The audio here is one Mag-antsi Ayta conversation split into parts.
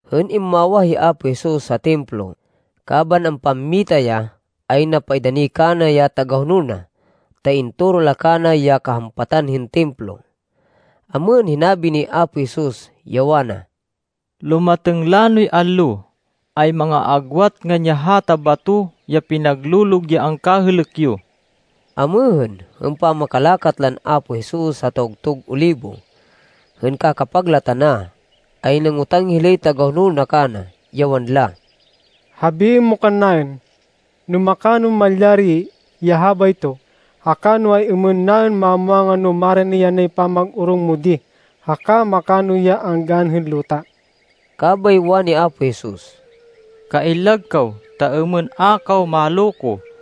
Hên immawah hi Apo Jesus ha Templo, kaban ampammita ya, ay napaidani kana ya tagahonol na, ta intoro la kana ya kahampatan hên Templo. Amêhên, hinabi ni Apo Jesus, ya wana, “Lumatêng lanoy allo, ay manga-aagwat ngan ya hata bato ya pinaglolog ya angkahêlêk yo.” Amêhên, hên pamakalakat lan Apo Jesus ha Tawgtug Olibo, hên kakapag la tana, ay nangotang hilay tagahonol na kana, ya wanla, “Habiên mo kannaên no makanon malyari ya habayto, haka no ay-êmên naên mamwangan no marani yanay pamag-orong mo di, haka makano ya anggaan hên luta.” Kabay wani Apo Jesus, “Kaillag kaw, ta êmên a kaw maloko,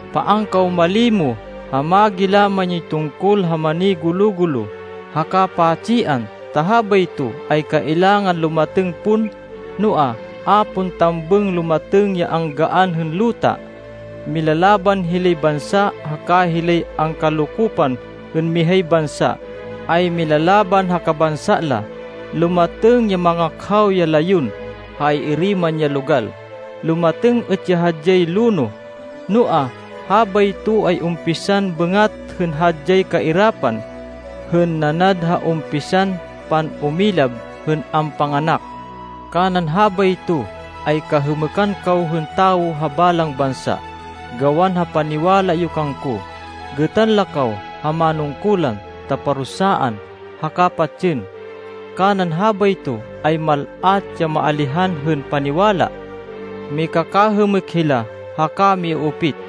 Paan kaw malimo ha magilaman yoy tungkol ha manigulo-gulo haka pa-tsian, ta habayto ay kailangan lumatêng pon, noa, a pon tambêng lumatêng ya anggaan hên luta. Milalaban hilay bansa haka hilay angkalokopan hên mihay bansa ay milalaban ha kabansa la. Lumatêng ya mangakhaw ya layon ha ay-iri man ya logal. Lumatêng êt ya hadyay lonoh. Noa, habayto ay umpisan bêngat hên hadyay kairapan, hên nanad ha umpisan pan-umilab hên ampanganak. “Kanan habayto ay kahêmêkan kaw hên tawo ha balang bansa gawan ha paniwala yo kangko. Gêtan la kaw ha manungkulan, ta parusaan haka patsên. Kanan habayto, ay mal-at ya maalihan hên paniwala. Mikakahêmêk hila haka miuupit.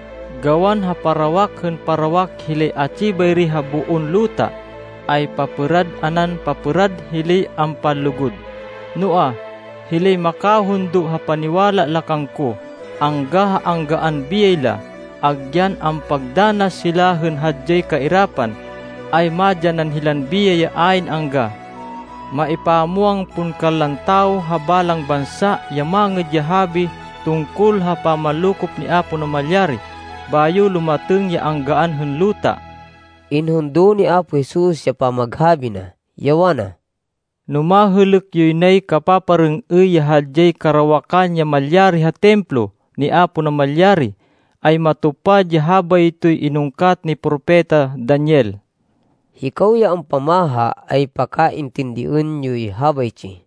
Gawan ha parawak hên parawak hilay atsi bayri ha boon luta, ay papêrad anan papêrad hilay ampanlugud. Noa, hilay makahundo ha paniwala la kangko, angga ha anggaan biyay la, agyan ampagdanas hila hên hadyay kairapan, ay madyanan hên biyay ya ayn angga. Maipamwang pon kanlan tawo ha balang bansa ya Mangêd ya Habi tungkol ha pamanlokop ni Apo Namalyari, bayo lumatêng ya anggaan hên luta.” Inhundo ni Apo Jesus ya pamaghabi na, ya wana, “No mahêlêk yoy nay kapaparêng-êy ya hadyay karawakan ya malyari ha Templo ni Apo Namalyari, ay matupad ya habaytoy inungkat ni Propeta Daniel.” Hikaw ya ampamaha ay pakaintindiên yoy habaytsi!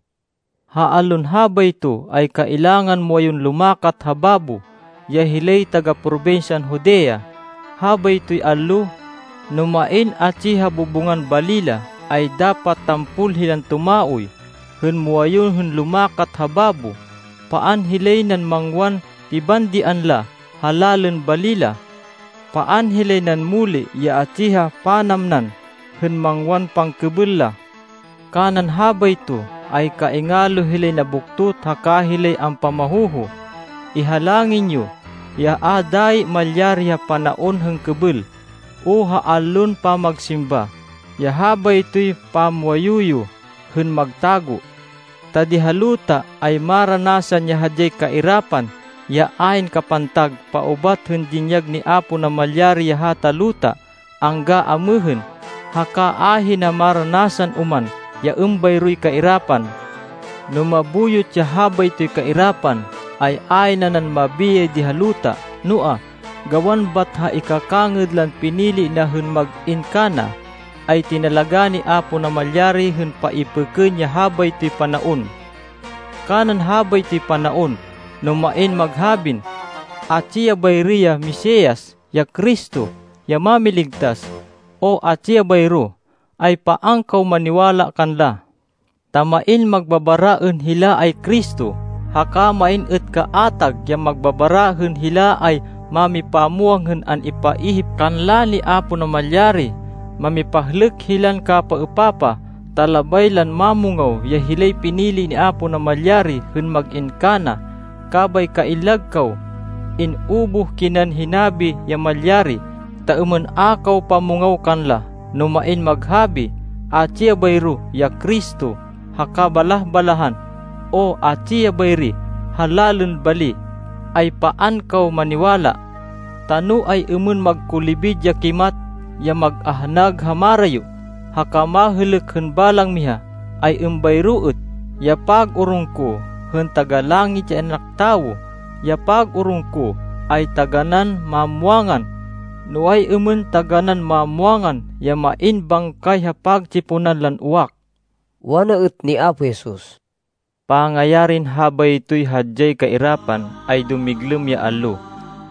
“Ha allon habayto ay kailangan muwayun lumakat ha babo, ya hilay taga-probinsyan Judea. Habaytoy allo, no main atsi ha bubungan bali la, ay dapat tampol hilan tumaoy hên muwayun hên lumakat ha babo! Paan hilay nan mangwan pibandian la ha lalên bali la! Paan hilay nan muli ya atsi ha panamnan hên mangwan pangkêbêl la! Kanan habayto, ay kaingalo hilay nabuktot haka hilay ampamahoho. Ihalangin yo, ya a dayi malyari ha panaon hên kêbêl o ha allon pamagsimba, ya habaytoy pammuwayu yo hên magtago. Ta di ha luta ay maranasan ya hadyay kairapan, ya ayn kapantag paubat hên dinyag ni Apo Namalyari ya hata luta angga amêhên. Haka ahina maranasan oman ya êmbayroy kairapan. No mabuyot ya habaytoy kairapan, ay ayn nanan mabiyay di ha luta, noa, gawan bat ha ikakangêd lan pinili na hên mag-in kana, ay tinalagá ni Apo Namalyari hên paipêkên ya habaytoy panaon. “Kanan habaytoy panaon, no main maghabin, ‘Atsi ya bayri ya Mesias, ya Cristo, ya Mámiligtas, o atsi ya bayro,’ ay paan kaw maniwala kanla. Ta main magbabara hên hila ay Cristo, haka main êt kaatag ya magbabara hên hila ay mámipamwang hên an-ipaihip kanla ni Apo Namalyari. Mamipahlêk hilan kapapaêpapah ta labay lan mámungaw ya hilay pinili ni Apo Namalyari hên mag-in kana. Kabay kaillag kaw! In-ubuh kinan hinabi ya malyari, ta êmên a kaw pamungaw kanla. “No main maghabi, ‘Atsi ya bayro ya Cristo ha kabalah-balahan!’ o ‘Atsi ya bayri ha lalên bali!’ ay paan kaw maniwala. Ta no ay-êmên magkulibid ya kimat, ya mag-ahnag ha marayo, haka mahêlêk hên balang miha, ay êmbayro êt ya pag-orong ko, hên Taga-Langit, ya In-anak Tawo. Ya pag-orong ko ay taganán mamwangan, no ay-êmên taganán mamwangan ya main bangkay ha pagtsiponan lan uwak.” Wana êt ni Apo Jesus, “Pangayarin habaytoy hadyay kairapan, ay dumiglêm ya allo,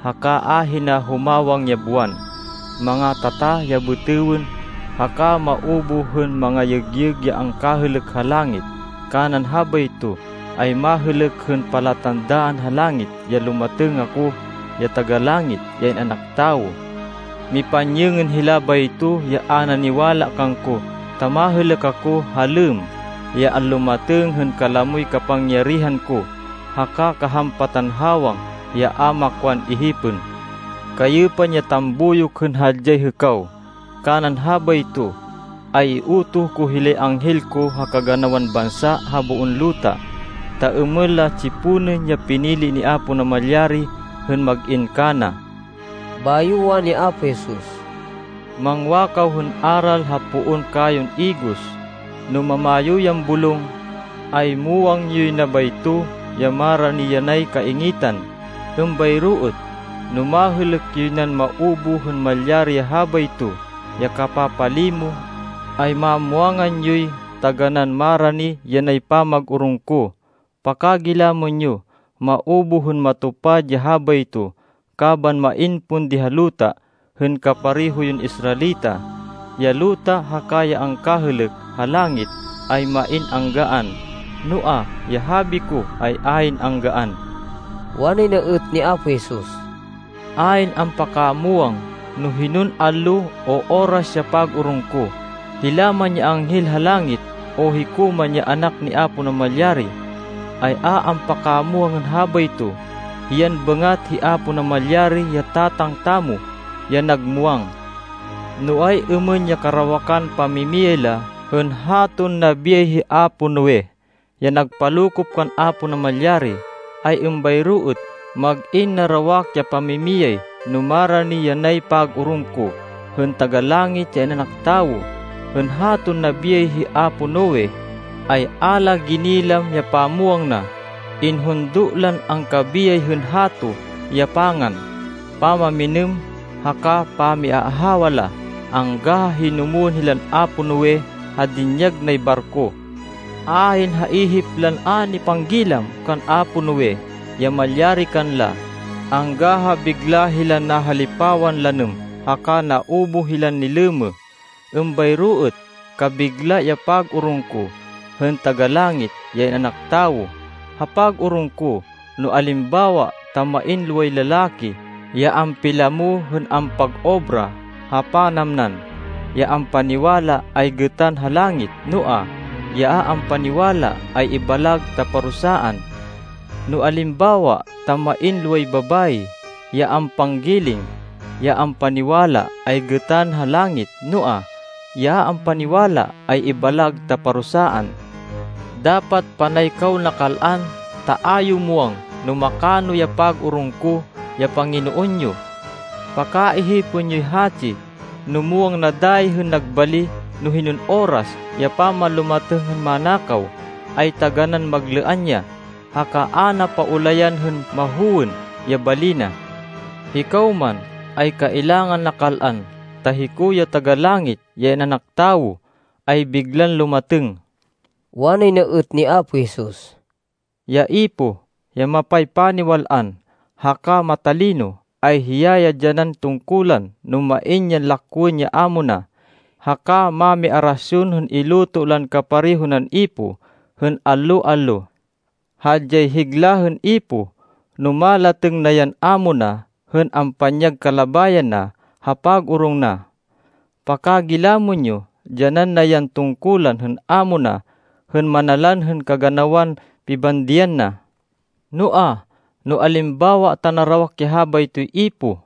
haka ahina humawang ya buwan, mangatata ya bêtêwên, haka maubuh hên mangayêgyêg ya angkahêlêk ha langit. Kanan habayto, ay mahêlêk hên palatandaan ha langit ya lumatêng ako, ya Taga-Langit, ya In-anak Tawo. Mipanyêngên hila bayto ya a naniwala kangko, ta mahêlêk ako, ha lêmm, ya anlumatêng, hên kalamoy kapangyarihan ko, haka kahampatan hawang ya a makwan ihipên. Kayêpan ya tambuyok hên hadyay hêkaw. Kanan habayto, ay iutoh ko hilay anghel ko ha kaganawan bansa ha boon luta, ta êmên la tsiponên ya pinili ni Apo Namalyari hên mag-in kana.” Bayo wani Apo Jesus, “Mangwa kaw hên aral ha poon kayon igos. No mamayo yan bulong, ay muwang yoy na bayto ya marani yanay kaingitan. Êmbayro êt, no mahêlêk yoy nan maubuh hên malyari ya habayto ya kapapalimo, ay mamwangan yoy taganán marani yanay pamag-orong ko. Pakagilamên yo. Maubuh hên matupad ya habayto kaban main pon di ha luta hên kapareho yon Israelita. Ya luta haka ya angkahêlêk ha langit ay main anggaan, noa, ya habi ko ay ayn anggaan.” Wanay na êt ni Apo Jesus, “Ayn ampakamwang no hinon allo, o oras ya pag-orong ko. Hila man ya anghel ha langit, o hiko man ya Anak ni Apo Namalyari, ay a ampakamwang hên habayto. Hiyan bat hi Apo Namalyari ya Tatang tamo, ya nag muwang. No ay-êmên ya karawakan pamimiyay la hên haton nabiyay hi apo Noe, ya nagpalokop kan Apo Namalyari, ay êmbayro êt mag-in narawak ya pamimiyay no marani yanay pag-orong ko, hên Taga-Langit, ya In-anak Tawo. Hên haton nabiyay hi apo Noe, ay a la ginilam ya pamwang na. Inhundo lan angkabiyay hên hato ya pangan, pamamminêm, haka pamiaahawa la angga ha hinumwên hilan apo Noe ha dinyag nay barko. Ayn ha ihip lan a nipanggilam kan apo Noe ya malyari kanla, angga ha bigla hilan nahalipawan lanêm haka naubuh hilan nilêmêh. Êmbayro êt kabigla ya pag-orong ko, hên Taga-Langit, ya In-anak Tawo. Ha pag-orong ko, no alimbawa ta main loway lalaki ya ampilamo hên ampag-obra ha panamnan, ya ampaniwala ay gêtan ha langit, noa, ya a ampaniwala ay ibalag ta parusaan. No alimbawa ta main loway babayi ya ampanggiling, ya ampaniwala ay gêtan ha langit, noa, ya a ampaniwala ay ibalag ta parusaan. Dapat panay kaw nakal-an, ta a yo muwang no makano ya pag-orong ko, ya Panginoon yo. Pakaihipên yoy hatsi, no muwang na dayi hên nag bali no hinon oras ya pamanlumatêng hên manakaw, ay taganán maglêan ya, haka a na paulayan hên mahowên ya bali na. Hikaw man, ay kailangan nakal-an, ta hiko ya Taga-Langit, ya In-anak Tawo, ay biglan lumatêng.” Wanay na êt ni Apo Jesus, “Ya ipoh ya mapaypaniwal-an haka matalino, ay hiya ya dyanan tungkulan no main yan lakwên ya amo na. Hiya ya manalan bali na, haka mami-arasyon hên iluto lan kapareho nan ipoh, hên allo-allo. Hadyay higla hên ipoh, no malatêng na yan amo na hên ampanyag kalabayan na ha pag-orong na. Pakagilamên yo, dyanan na yan tungkulan hên amo na hên manalan hên kaganawan pibandian na. Noa, no alimbawa ta narawak ya habaytoy ipoh,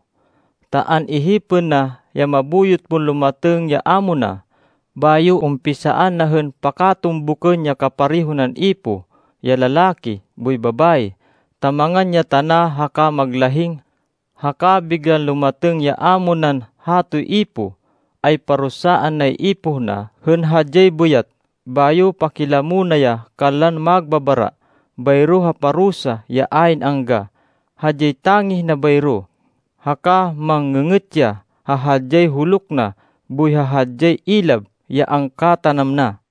ta an-ihipên na ya mabuyot pon lumatêng ya amo na, bayo umpisaan na hên pakatumbukên ya kapareho nan ipoh, ya lalaki boy babayi, ta mangan ya tana haka maglahing, haka biglan lumatêng ya amo nan hatoy ipoh, ay parusaan nay ipoh na hên hadyay bêyat. Bayo pakilamo na ya kanlan magbabara, bayro ha parusa ya ayn angga. Hadyay tangih na bayro, haka mang-ngê-ngêt ya ha hadyay huluk na boy ha hadyay ilab ya angkatanam na.”